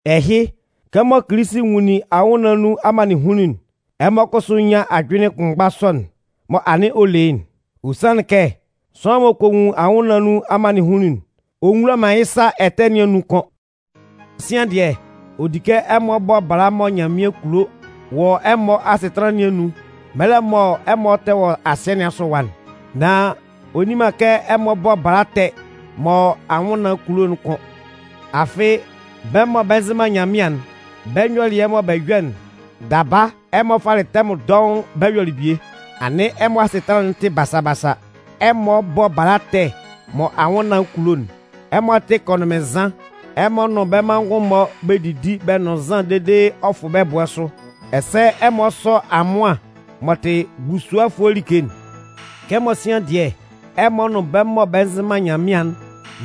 Ɛhɩ, kɛmɔ Kilisi nwunlin anwʋnnaan nun amannɩnhunnun'n, ɛmɔ kʋsʋ nyán ajʋnlɩn kʋnmgba sɔ'n mɔ anɩn ɔ le yɩ́'n. Ɔ sanlɩn kɛ sʋanlan m'ɔ kɔ nwun anwʋnnaan nun amannɩnhunnun'n, ɔ nwula man yɩ́ sa ɛtɛ nɩn anun kʋ́n. Sian dɩɛ, ɔ di kɛ ɛmɔ bɔ bala mɔ Nyanmɩan kulo wɔ ɛmɔ asɩtanlan nɩn anun mɛlɛ mɔ ɛmɔ tɛ wɔ asɩɛ nɩn asʋ ɛwa'n. Nan ɔ nni man kɛ ɛmɔ bɔ bala ɛtɛ mɔ anwʋnnaan kulo'n kʋ́n. Afɩ, bɛ́ mɔ bɛ nzɩ man Nyanmɩan'n, bɛ́ nyɔlɩɛ mɔ bɛ yɔ'n, daba ɛmɔ falɩ tɛmʋn dɔʋn bɛ yɔlɩ bie. Anɩn ɛmɔ asɩtanlan'n tɩ basa-basa, ɛmɔ bɔ bala ɛtɛ mɔ anwʋnnaan kulo'n, ɛmɔ tɩ kɔnʋnmɩnnzan, ɛmɔ nʋn bɛ́ manngʋn-mɔ bɛ didi bɛ nʋn nzan dede ɔ fʋ bɛ bʋ́ɛ sʋ, ɛsɛ ɛmɔ sɔ amʋan m'ɔ tɩ busuɔfʋɛ like'n. Kɛmɔ sian dɩɛ, ɛmɔ nʋn bɛ́ mɔ bɛ nzɩ man Nyanmɩan'n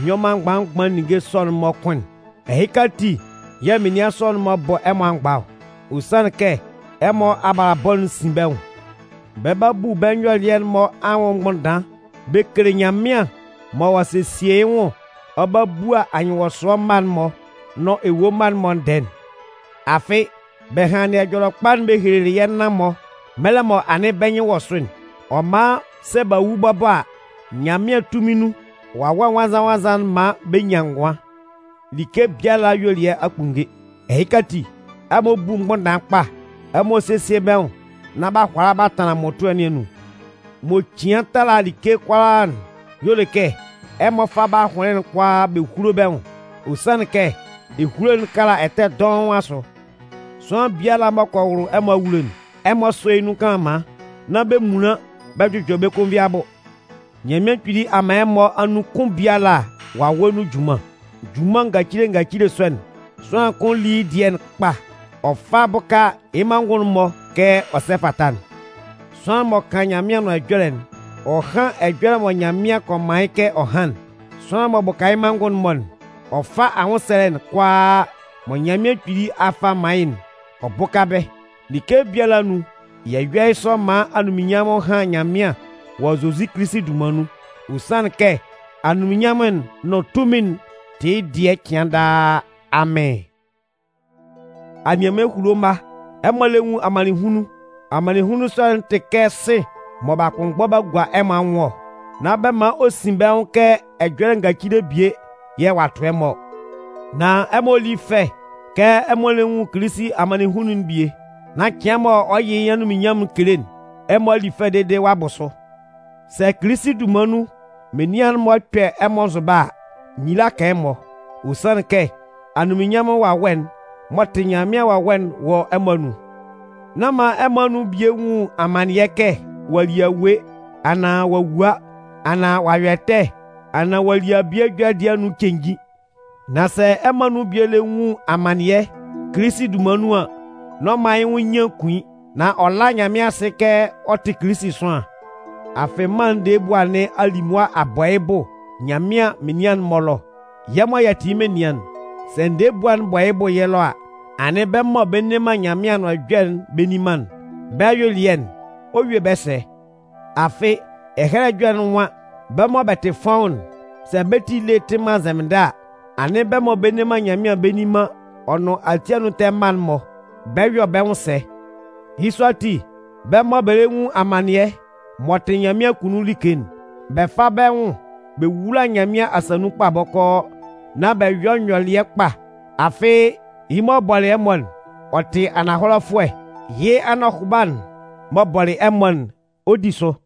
nyɔ man mgban-mgban ninnge sɔ'n-mɔ kʋ́n'n, ɛhɩka ati yɛ̂ menian sɔ'n-mɔ bɔ ɛmɔ amgba ɔ. Ɔ sanlɩn kɛ ɛmɔ abalabɔ'n sin bɛ́ nwʋn. Bɛ 'ba bu bɛ́ nyɔlɩɛ'n-mɔ anwʋn mgbʋnndan bɛ kele Nyanmɩan mɔ ɔ'a sesie yɩ́ nwʋn ɔ 'ba bua anyɩnwɔsʋɛ mma'n-mɔ nʋn ewue mma'n-mɔ ndɛɛ'n. Afɩ bɛ hanlɩn Ɛjɔlɛkpa'n bɛ helelɩ yɛ́ nan-mɔ mɛlɛ mɔ anɩn bɛ́ nyɩn wɔ sʋ'n. Ɔ man sɛ b'a wu bɔbɔ a, Nyanmɩan tunmin nun, Wawɛ Nwannzan-nwannzan'n 'man bɛ nyan ngʋan. Like biala ayuelɩɛ a kpunnge. Ɛhɩka ati, ɛmɔ bú mgbʋnndan kpa. Ɛmɔ sésie bɛ́ nwʋn nán b'a hʋala b'a tanlan mmʋtʋɛ nɩn anun. M'ɔ cian tala like kʋalaa'n y'ɔ le kɛ ɛmɔ fá bɛ́ ahʋnlɩn'n kʋalaa bɛ húlo bɛ́ nwʋn. Ɔ sanlɩn kɛ ehulo'n kala ɛtɛ dɔʋn asʋ. Sʋanlan biala m'ɔ kɔ wʋlʋ ɛmɔ awulo'n, ɛmɔ sɔ́ yɩ́ nun kanlanman, nán bɛ munlan bɛ jʋjɔ bɛ́ konvin abʋ. Nyanmɩan Kpili a man ɛmɔ anun kʋn biala Wawɛ nun junman. Junman ngacile ngacile sɔ'n, sʋanlan kʋn lí yɩ́ dɩɛ'n kpa ɔ fá bʋ́ka yɩ́ manngʋn'n-mɔ kɛ ɔ sɛ fata'n. Sʋanlan m'ɔ kan Nyanmɩan Anʋan Ɛjɔlɛ'n, ɔ hán ɛjɔlɛ mɔ Nyanmɩan kɔ man yɩ́ kɛ ɔ hán'n. Sʋanlan m'ɔ bʋka yɩ́ manngʋn'n-mɔ'n, ɔ fá anwʋnsɛlɛ'n kʋalaa mɔ Nyanmɩan Kpili a fa a man yɩ́'n ɔ bʋ́ka bɛ́. Like biala anun, yɛ yɔ́ yɩ́ sɔ maan anunminnyanmʋn hán Nyanmɩan wɔ Zozi Kilisi dunman nun. Ɔ sanlɩn kɛ anunminnyanmʋn'n nʋn tunmin'n tɩ yɩ́ dɩɛ cɩan daa. Amɩn! Anianman ehulo mma, ɛmɔ lɛ nwun amannɩnhunnun. Amannɩnhunnun sɔ'n tɩ kɛ sɩ̂n mɔ b'a kpʋnmgbɔ b'a gua ɛmɔ anwʋn ɔ. Nán bɛ man ɔ sin bɛ́ nwʋn kɛ ɛjɔlɛ ngacile bie yɛ̂ ɔ'a tʋ ɛmɔ ɔ. Nan ɛmɔ lí fɛ kɛ ɛmɔ lɛ nwun Kilisi amannɩnhunnun'n bie, nán cɩan mɔ ɔ 'yɩ yɩ́ anunminnyanmʋn'n kele'n, ɛmɔ a li fɛ dede ɔ'a bʋ sʋ. Sɛ Kilisi dunman nun menian'n-mɔ kpɛ ɛmɔ nzʋba a, nyila kan ɛmɔ. Ɔ sanlɩn kɛ anunminnyanmʋn Wawɛ'n m'ɔ tɩ Nyanmɩan Wawɛ'n wɔ ɛmɔ anun. Nán man ɛmɔ anun bie nwun amannɩɛ kɛ ɔ'a li awue, anaan ɔ'a wua, anaan ɔ'a yɔ ɛtɛ, anaan ɔ'a li abie ɛjɔlɛ dɩɛ anun cenjin. Nan sɛ ɛmɔ anun bie lɛ nwun amannɩɛ Kilisi dunman nun an, n'ɔ man yɩ́ nwʋn nyian kun yɩ́. Nan ɔ lá Nyanmɩan asɩ kɛ ɔ tɩ Kilisi sʋanlan. Afɩ mân'n ndɛɛ ebua nɩn a li mʋa a bɔ yɩ́ bʋ Nyanmɩan menian'n-mɔ ɛlɔ. Yɛ́ mɔ yɛ tɩ yɩ́ menian'n, sɛ ndɛɛ ebua'n bɔ yɩ́ bʋ yɛ́ ɛlɔ a, anɩn bɛ́ mɔ bɛ nne man Nyanmɩan Anʋan Ɛjɔlɛ'n bɛ nni man'n, bɛ́ ayuelɩɛ'n, ɔ 'yue bɛ́ sɛ? Afɩ Ɛhɛlɛ Ɛjɔlɛ'n nwan: Bɛ́ mɔ bɛ tɩ fɔ́ʋ́n'n, sɛ bɛ́ ti ele tɩ man nzɛmɩndɛ a, anɩn bɛ́ mɔ bɛ nne man Nyanmɩan bɛ nni man ɔ nʋn ati anun ɛtɛ mma'n-mɔ, bɛ 'yɔ bɛ́ nwʋn sɛ? Yɩ́ sɔ ati, bɛ́ mɔ bɛ lɛ nwun amannɩɛ, m'ɔ tɩ Nyanmɩan akunnun like'n, bɛ fá bɛ́ nwʋn bɛ wúla Nyanmɩan asa nun kpa bɔkɔɔ nán bɛ yɔ́ nyɔlɩɛ kpa. Afɩ yɩ́ m'ɔ bɔlɩ ɛmɔ'n, ɔ tɩ ananhɔlɛfʋɛ, yɩ́ anɔhʋba'n m'ɔ bɔlɩ ɛmɔ'n, ɔ 'di sʋ.